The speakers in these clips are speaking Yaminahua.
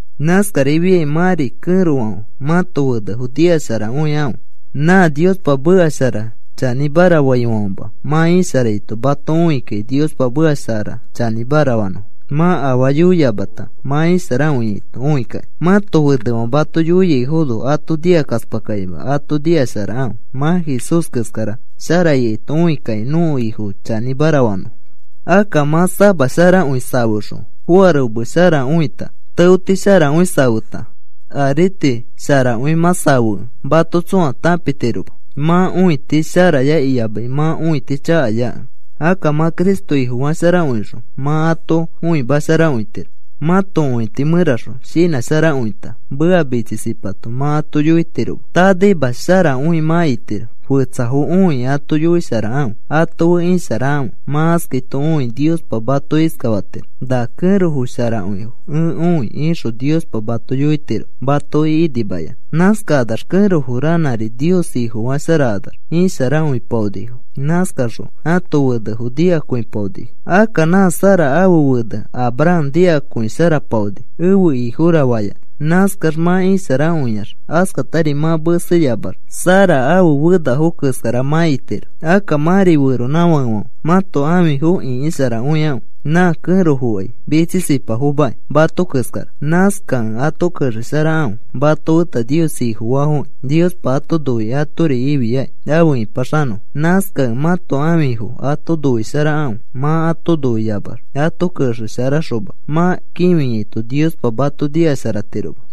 Nãskarifiakĩ mãri kẽrofãfe, mãto fenefo nikasharakõikãfe. Nã Niospa meka shara chanĩmara faifãfema mã isharaito mato õikakĩ Niospa meka shara chanĩmara fanõfo, mã afaa yoiyamata mã isharakõiaito õikakĩ. Mãto fenefãfe mato yoiaifono ato nikakaspakakĩma ato nikasharakãfe. Mã Jesús keskara shara ikaito õikakĩ nõko Ifo chanĩmara fanõfo. Akka mã samasharakõi safexõ, foarome sharakõita, teoti sharakõi safeta, parotameti sharakõi mã safekẽ, mato tsõa tãpitiroma mã õiti sharaya iyamai mã õiti chakayakẽ. Akka mã Cristo Ifofasharakõixõ mã ato õimasharakõitiro. Mãto õiti mẽraxõ shinãsharakõita, meka mitsisipato mã ato yoitiroma, tanaima sharakõi mã itiro. Fetsafo õikĩ ato yoisharakãfe, ato fe isharakãfe. Mã askaito õikĩ Niospa mato iskafatiro: “Na kẽrofo sharakõifo ẽ õi,” ixõ Niospa mato yoitiro matoki inimayanã. Nãskakanax kẽrofo ranãri Nios Ifofasharakanax isharakõipaonifo. Nãskakaxõ ãto fenefo nikakõisharapaonifo. Akka nã Sara ãfe fene Abraham nikakõisharapaoni, “Ẽfe ifora,” fayanã. Nãskax mã isharakõiax, askatari mã meseyamax Sara ãfe fenafo keskara mã itiro. Akka mãri feronãfakefãfe, mãto ãfifo ĩkisharakõikãfe. Nã kẽrofokai mitsisipafomakĩ mato keskara. Nãskakẽ ato kexesharakãfe, mato feta Nios Ifofaafoki Niospa ato noikĩ atori ifiakĩ afe ipaxanõfo. Nãskakẽ mãto ãfifo ato noisharakãfe. Mã ato noiamax ato kexesharaxoma mã kĩfiaito Niospa mato nikasharatiroma.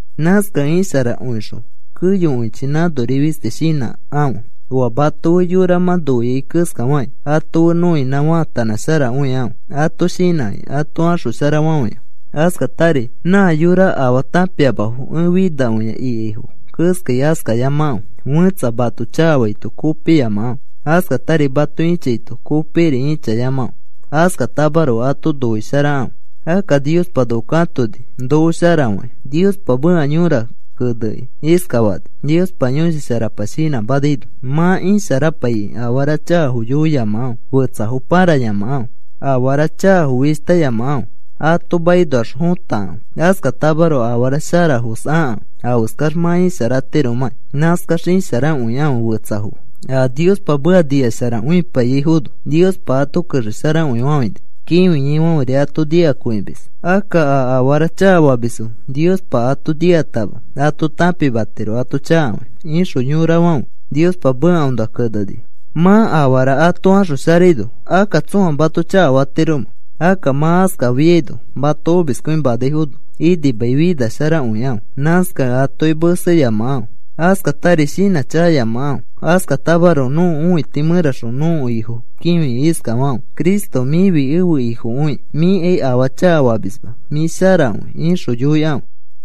Nãskakẽ isharakõixõ keyokõichi nãnori fisti shinãsharakãfe. Oa mato fe yora mã noiai keskafakĩ ato fe nõinã faatanãsharakõikãfe. Ato shinãkĩ ato axosharafafãikãfe. Askatari, “Nã yora afaa tãpiamafo ẽ finakõia,” ikaifo keskai askayamakãfe. Fẽtsa mato chakafaito kopiyamakãfe. Askatari mato ĩchaito kopikiri ĩchayamakãfe. Askatamaroko ato noisharakãfe, akka Niospa noko katonikĩ noko sharafakĩ. Niospa meka yõra kenekĩ iskafani, Niospa Yõshi Sharapa shinãmanaino: Mã isharapaikĩ afara chakafo yoiyamakãfe, fetsafo pãrayamakãfe. Afara chakafo fishtayamakãfe, ato makinoax fotakãfe. Askatamaroko afara sharafos akãfe. Afeskax mã isharatiromãkĩ nãskax isharakõikãfe fetsafo fe. A Niospa meka nikasharakõipaiyaifono Niospa ato kexesharakõifafãini, kĩfiaifãferi ato nikakõimis. Akka a afara chakafamisfo Niospa ato nikatama ato tãpimatiro ato chakafakĩ, ixõ yorafãfe Niospa mekaõnoa kenenifo. ¿Mã afara ato axosharaino, akka tsõa mato chakafatiromẽ? Akka mã askafiaino mato omiskõimanaifono inimai finasharakõikãfe. Nãskakẽ atoki meseyamakãfe, askatari shinãchakayamakãfe. Askatamaroko nõko õiti mẽraxõ nõko Ifo kĩfikĩ iskafakãfe: “Cristo, mĩfi ẽfe Ifokõiki. Mĩkai afaa chakafamisma, mĩ sharakõi,” ixõ yoikãfe.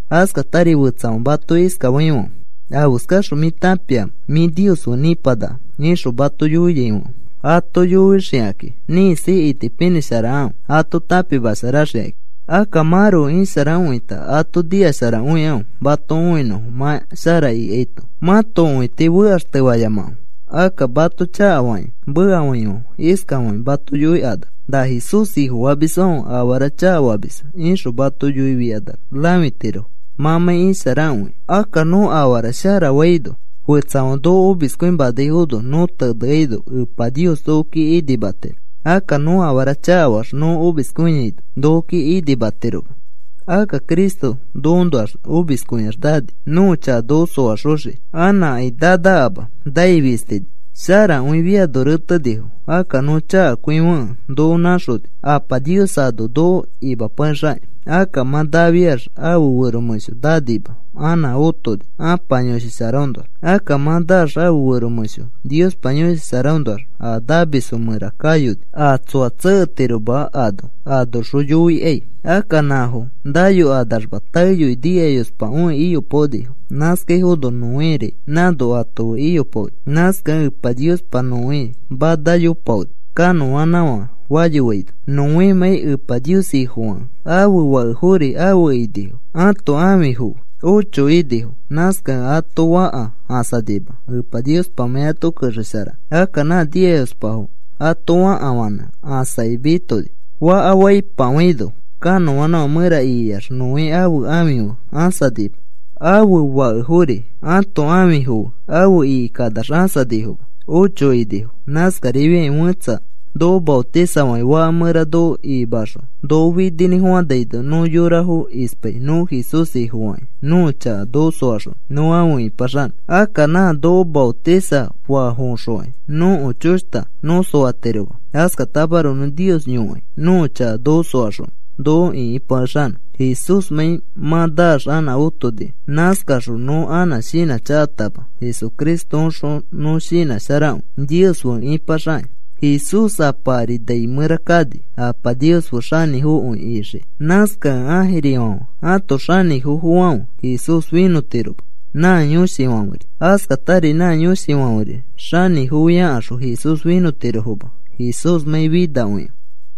Askatari fetsafãfe mato iskafaifãfe: “¿Afeskaxõ mĩ tãpiamẽ mĩ Nios fe ipanaka?” ixõ mato yoiaifãfe ato yoixikakĩ ĩkisi itipinĩsharakãfe ato tãpimasharaxikakĩ. Akka mãroko isharakõita ato nikasharakõikãfe, mato õinõfo mã shara ikaito. Mãto õiti fekaxtefayamakãfe. Akka mato chakafakĩ mekafaifãfe iskafakĩ mato yoikanax: “Na Jesús Ifofamisfãfe afara chakafamisfo,” ixõ mato yoifikanax rãfitirofo mãmãi isharakõikẽ. Akka nõ afara shara faino fetsafãfe noko omiskõimanaifono nõ teneaino Epa Nios nokoki inimatiro. Akka nõ afara chakafaax nõ omiskõiaino nokoki inimatiroma. Akka Cristo nokoõnoax omiskõiax nani nõko chaka noko soaxoxiki. Anãkai nanakama nai fistini. Sharakõifiano retenifo. Akka nõ chakakõifokẽ noko nãxoni. Apa Nios ano noko imapakexakĩ. Akka mã nafiax ãfe fero mẽsho nanima, anã otoni Ãpa Yõshi Sharaõnoax. Akka mã naax ãfe fero mẽsho Niospa Yõshi Sharaõnoax a namisfo mẽra kayoni a tsoa tseketiroma ano, anoxõ yoikai. Akka nãfo nayokanaxma taeyoi nikayospakõi iyopaonifo. Nãskaifono Noéri nãno ato fe iyopaoni. Nãskakẽ Epa Niospa Noé manayopaoni kanõanãfã fayofaino, Noémãi Epa Nios Ifofakẽ. Ãfe fakefori afe inifo, ãto ãfifo fe. Ocho inifo. Nãskakẽ ato fãka ãsanima Epa Niospamãi ato kexesharakẽ. Akka nã nikayospafo ato fakafãnẽ ãsakĩ mitoni. Faka faipafãino kanõanãfã mẽra ikiax Noé ãfe ãfi fe ãsanima. Ãfe fakefori ãto ãfifo fe afe ikikanax ãsanifoma. Ocho inifo. Nãskarifiakĩ fẽtsa noko maotisafakĩ faka mẽra noko ikimaxõ, noko fininĩfofanaino nõ yorafo ispai nõ Jesús Ifofakĩ nõko chaka noko soaxonõ nõ afe ipaxanõ. Akka nã noko maotisafafoõxokai nõko choshta nõ soatiroma. Askatamaroko nõ Nios yõkai nõko chaka noko soaxonõ noko ĩkipakexanõ Jesúsmãi mã naax anã otonikẽ. Nãskaxõ nõ anã shinãchakatama Jesucristoõxõ nõ shinãsharakõi Nios fe ĩpaxakĩ. Jesús Apa ari nai mẽra kani Apa Nios fe xanĩfokõi ixiki. Nãskakẽ ãjirifãfe ãto xanĩfofofãfe Jesús finõtiroma nã yõshifãferi. Askatari nã yõshifãferi xanĩfofiakaxõ Jesús finõtirofoma Jesúsmãi finakõikẽ.